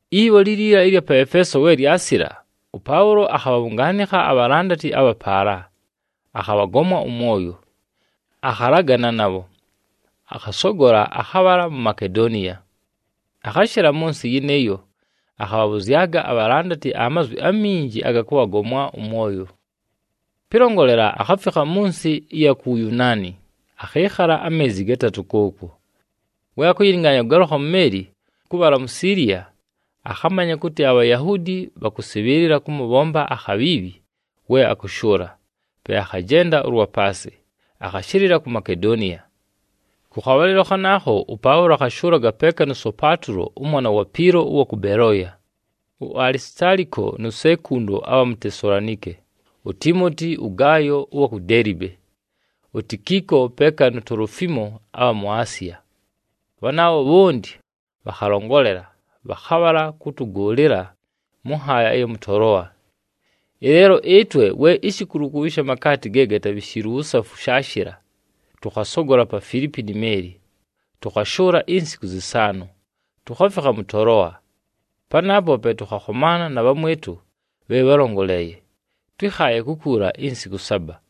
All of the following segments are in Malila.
Ibho liila ɨlya pa Efeeso, we lyasila, ʉPaʉlo akhabhabhʉngaanɨkha abhalandati abha paala, akhabhagomwa ʉmwoyo, akhalagana nabho, akhasogola akhabhala mu Makedoniya. Akhashɨla mʉ nsɨ yɨnɨɨyo, akhabhabhʉzyaga abhalandati amazwi aminji aga kʉbhagomwa ʉmwoyo. Pɨlongolela, akhafikha mʉ nsɨ ɨya ku Wuyunaani, akhɨɨkhala ameezi gatatʉ kʉʉkwo. We akʉyɨlɨngaanya kʉgalʉkha mu meeli kʉbhala mu Siiliya, akhamanya kʉtɨ aBhayahuudi bhakʉsɨbhɨɨlɨla kʉmʉbhomba akhabhiibhi we akʉshʉʉla, pe akhajenda ʉlwa paasɨ, akhashɨlɨla ku Makedoniya. Kʉ khabhalɨlo khanaakho, ʉPaʉlo akhashʉʉlaga peeka nu Sopatulo ʉmwana wa Piilo ʉwa kʉ Belooya, uAlisitaaliko nu Sekundo abha mu Tesalonike, uTiimoti, ʉGaayo ʉwa ku Deelibe, uTikiiko peeka nu Tolofiimo abha mu Asiya. Bhanaabho bhonti bhakhalongolela, bhakhabhala kʉtʉgʉʉlɨla mʉ nhaaya ɨya mʉ Toloa. Ɨleelo ɨtwe, we ishikulukulu ɨsha makaati ge gatabhishiilwe uwusafu shaashɨla, tʉkhasogola pa Filiipi ni meeli, tʉkhashʉʉla insiku zɨsaanʉ, tukhafikha mʉ Toloa. Panaapo pe tʉkhakhomaana na bhamwɨtʉ bhe bhálongoleeye, twɨ́khaaye kukuula insiku saba.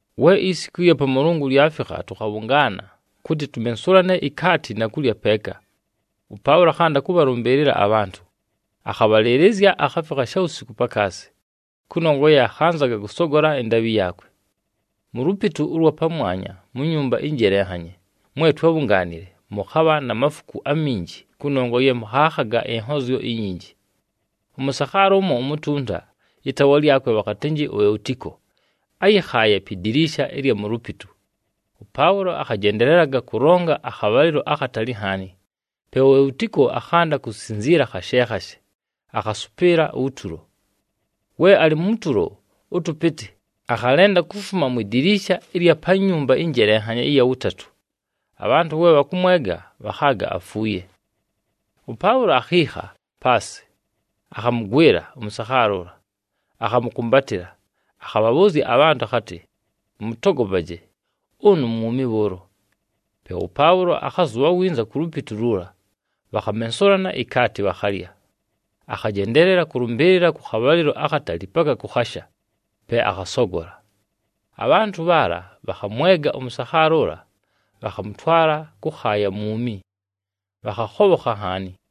We isiku ɨlya Pamʉlʉngʉ lyafikha, tʉkhabhʉngaana, kʉtɨ tumensulane ikaati na kulya peeka. ɄPaʉlo akhanda kʉbhalʉmbɨɨlɨla abhantʉ, akhabhalɨɨlɨzya akhafikha shawusiku pakaasi, kʉnongwa ye akhanzaga kʉsogola ɨndaabhɨ yaakwe. Mu lupitu ʉlwa pamwanya mu nyumba ɨnjelenhanye mwe twábhungaanile mʉkhabha na mafuku aminji kʉnongwa ye mʉkhaakhaga ɨnhozyo inyinji. Ʉmʉsakhaala ʉmo umutunta, ɨtaawa lyakwe bhakhatɨnjɨ Eutiko áyɨkhaaye pi diliisha ɨlya mu lupitu. ɄPaʉlo akhajendelelaga kʉlonga akhabhalɨlo akhatali nhaani, pe uEutiko akhanda kusinziila khashe khashe, akhasʉpɨɨla utulo. We alɨ mu tulo ʉtʉpɨtɨ, akhalenda kufuma mwi diliisha ɨlya pa nyumba ɨnjelenhanye ɨya wʉtatʉ, abhantʉ we bhakʉmwega, bhakhaaga afuuye. ɄPaʉlo akhiikha paasɨ, akhamʉgwɨla ʉmʉsakhaala ʉla, akhamʉkʉmbatɨla, akhabhabhʉʉzya abhantʉ akhatɨ, “Mʉtogopaje, ʉnʉ mwumi bhʉʉlo.” Pe ʉPaʉlo akhazʉbha winza ku lupitu luula, bhakhamensulana ikaati, bhakhalya. Akhajendeelela kʉlʉmbɨɨlɨla kʉ khabhalɨlo akhatali paka kʉkhasha, pe akhasogola. Abhantʉ bhaala bhakhamwega ʉmʉsakhaala ʉla, bhakhamʉtwala kʉkhaaya mwumi, bhakhakhobhokha nhaani.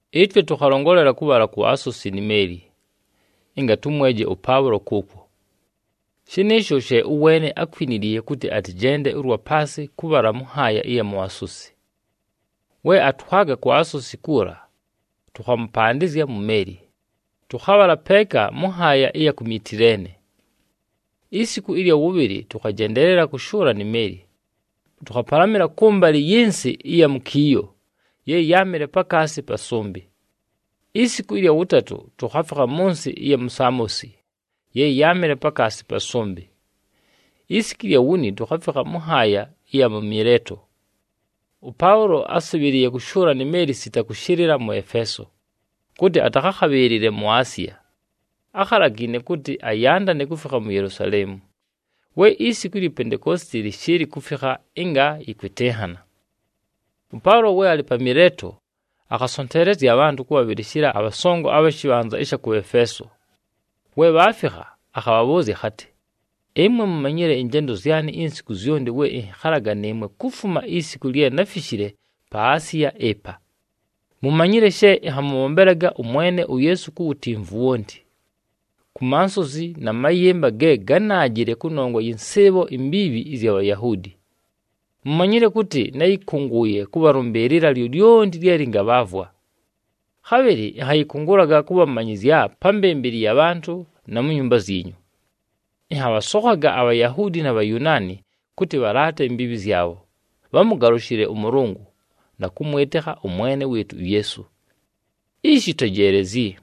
Ɨtwe tʉkhalongolela kʉbhala ku Asosi ni meeli, ɨnga tʉmweje ʉPaʉlo kʉʉkwo. Shɨnɨɨsho she ʉweene ákwiniliiye kʉtɨ atɨjende ʉlwa paasɨ kʉbhala mʉ nhaaya ɨya mu Asosi. We atwaga ku Asosi kuula, tʉkhamʉpandɨzya mu meeli, tʉkhabhala peeka mʉ nhaaya ɨya ku Mitileene. Isiku ɨlya wʉbhɨlɨ tʉkhajendeelela kʉshʉʉla ni meeli, tʉkhapalamɨla kʉmbalɨ yɨ nsɨ ɨya mu Kiiyo ye yáamɨle pakaasi pa sʉmbɨ. Isiku ɨlya wʉtatʉ tukhafikha mʉ nsɨ ɨya Samosi ye yáamɨle pakaasi pa sʉmbɨ. Isiku ɨlya wuni tukhafikha mʉ nhaaya ɨya mu Mileeto. ɄPaʉlo ásɨbhɨlɨɨye kʉshʉʉla ni meeli sita kʉshɨlɨla mʉ Efeeso, kʉtɨ atakhakhabhɨɨlɨle mu Asiya. Ákhalagiine kʉtɨ ayandane kufikha mu Yelusaleemu, we isiku ilyi Pentekoositi lɨshɨɨlɨ kufikha ɨnga yɨkwɨtɨnhana. ɄPaʉlo we alɨ pa Mileeto, akhasonteelezya abhantʉ kʉbhabhɨlɨshɨla abhasongo abha shɨbhanza ɨsha kʉ Efeeso. We bhaafikha, akhabhabhʉʉzya akhatɨ, “Ɨmwe mumanyile ɨnjendo zyanɨ insiku zyonti we ɨnhɨkhalaga nɨɨmwe kufuma isiku lye náfishile pa Asiya ɨpa. Mumanyile she ɨnhamʉbhombelaga ʉMwene uYeesu ku wutimvu wonti, ku mansozi na mayɨmba ge gánaajile kʉnongwa yɨ nsɨɨbho imbiibhi ɨzya Bhayahuudi. Mumanyile kʉtɨ náyɨkʉngʉʉye kʉbhalʉmbɨɨlɨla lyolyonti lye lɨngabhaavwa. Khabhɨlɨ ɨnhayɨkʉngʉlaga kʉbhamanyɨzya pa mbɨmbɨlɨ ya bhantʉ, na mu nyumba zyinyu. Ɨnhabhasokhaga aBhayahuudi na Bhayunaani kʉtɨ bhalaate imbiibhi zyabho, bhamʉgalʉshɨle ʉMʉlʉngʉ, na kʉmwɨtɨkha ʉMwene wɨɨtʉ uYeesu. “Ishi tejeelezyi,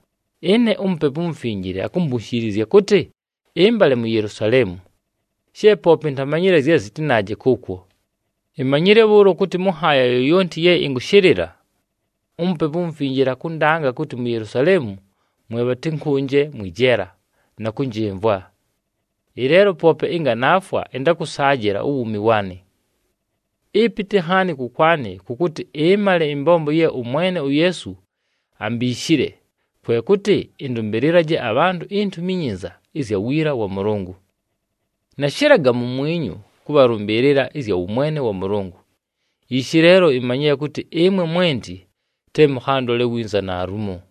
ɨne uMupepu uMufinjile akumbunshiilizya kʉtɨ ɨmbale mu Yelusaleemu, she poope intamanyile zye zɨtɨnaaje kʉʉkwo. Imanyile bhʉʉlo kʉtɨ mʉ nhaaya yoyonti ye ɨnkʉshɨlɨla, uMupepu uMufinjile akʉndanga kʉtɨ mu Yelusaleemu mwe bhatɨnkʉnje mwɨ jeela, na kʉnjɨmvwa. Ɨleelo poope ɨnga naafwa, ɨntakʉsaajɨla uwuumi waanɨ. Ɨpɨtɨ nhaani kʉkwanɨ kʉ kʉtɨ ɨmale ɨmbombo ye ʉMwene uYeesu ambiishile, kwe kʉtɨ ɨndʉmbɨlɨlaje abhantʉ iNtumi iNyinza ɨzya wiila wa Mʉlʉngʉ. “Nashɨlaga mumwinyu kʉbhalʉmbɨɨlɨla ɨzya wʉmwene wa Mʉlʉngʉ. Ishi leelo, imanyile kʉtɨ ɨmwe mwenti te mʉkhandole winza naalumo.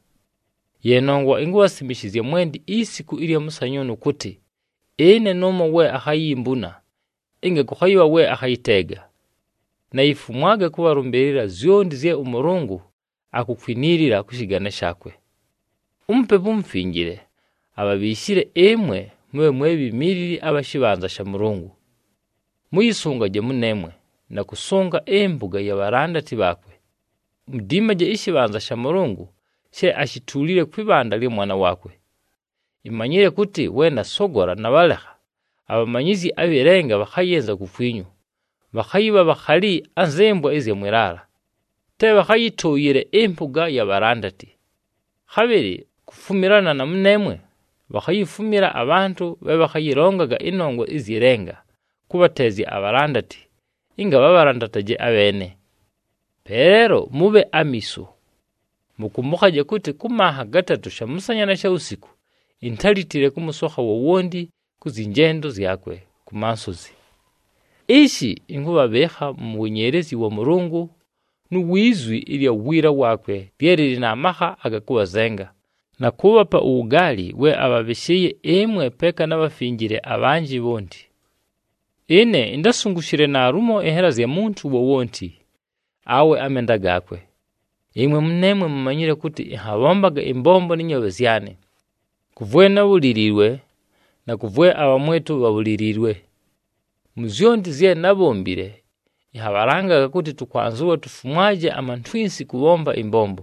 Ye nongwa inkubhasimishizya mwenti isiku ɨlya mʉsanyʉʉnʉ kʉtɨ, ɨne nʉʉmo we akhayimbuna, ɨnga kʉkhayɨbha we akhayɨteega. Nayifumwaga kʉbhalʉmbɨɨlɨla zyonti zye ʉMʉlʉngʉ akukwiniilila kʉ shɨgane shaakwe. UMupepu uMufinjile abhabhiishile ɨmwe mʉbhe mwe bhimiilili abha shɨbhanza sha Mʉlʉngʉ. Mʉyɨsʉngaje mʉneemwe, na kʉsʉnga ɨmpʉga ya bhalandati bhaakwe. Mudiimaje ɨshɨbhanza sha Mʉlʉngʉ she ashituulile kwɨ bhanda lya Mwana waakwe. Imanyile kʉtɨ we nasogola nabhalekha, abhamanyizyi abhɨ lenga bhakhayɨnza kukwinyu, bhakhayɨbha bhakhali anzɨ mbwa ɨzya mwɨ laala, te bhakhayɨtʉʉyɨle ɨmpʉga ya bhalandati. Khabhɨlɨ kufumilana na mʉneemwe, bhakhayifumila abhantʉ bhe bhakhayɨlongaga ɨnongwa ɨzyɨ lenga kʉbhateezya abhalandati, ɨnga bhabhalandataje abheene. Pe leelo mʉbhe amiiso! Mʉkʉmbʉkhaje kʉtɨ kʉ manha gatatʉ shamʉsanya na shawusiku intálitile kʉmʉsokha wowonti kʉ zyɨ njendo zyakwe ku mansozi. “Ishi ɨnkʉbhabhɨɨkha mu wenyeelezyi wa Mʉlʉngʉ nu wi zwi ɨlya wiila waakwe lye lɨlɨ na makha aga kʉbhazenga, na kʉʉbhapa uwugaali we abhabhɨshɨɨye ɨmwe peeka na bhafinjile abhanjɨ bhonti. Ɨne intásungushile naalumo ɨnhela zya muntu wowonti, awe amenda gaakwe. Ɨmwe mʉneemwe mumanyile kʉtɨ ɨnhabhombaga ɨmbombo nɨ nyoobhe zyanɨ, kʉ vwe nábhuliliiwe, na kʉ vwe abhamwɨtʉ bhabhuliliiwe. Mu zyonti zye nábhombile, ɨnhabhalangaga kʉtɨ tʉkwanzɨwa tufumwaje amantwinsi kʉbhomba ɨmbombo,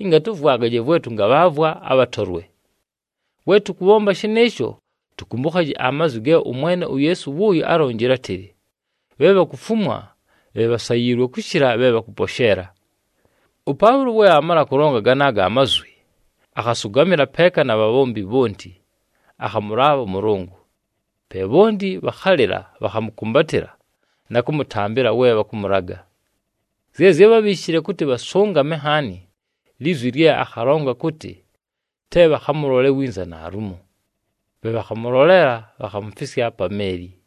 ɨnga tʉvwagaje vwe tʉngabhaavwa abhatolwe. We tʉkʉbhomba shɨnɨɨsho, tʉkʉmbʉkhaje amazwi ge ʉMwene uYeesu wʉʉyo álonjile átɨlɨ, ‘Bhe bhakufumwa, bhe bhasayiilwe kʉshɨla bhe bhakʉposheela.’” ɄPaʉlo we aamala kʉlonga ganaago amazwi, akhasʉgamɨla peeka na bhanaabho bhonti, akhamʉlaabha ʉMʉlʉngʉ. Pe bhonti bhakhalɨla, bhakhamʉkʉmbatɨla na kʉmʉtambɨla we bhakʉmʉlaga. Zye zyábhabhiishile kʉtɨ bhasʉngame nhaani, lizwi lye akhalonga kʉtɨ te bhakhamʉlole winza naalumo. Pe bhakhamʉloleela, bhakhamufisya pa meeli.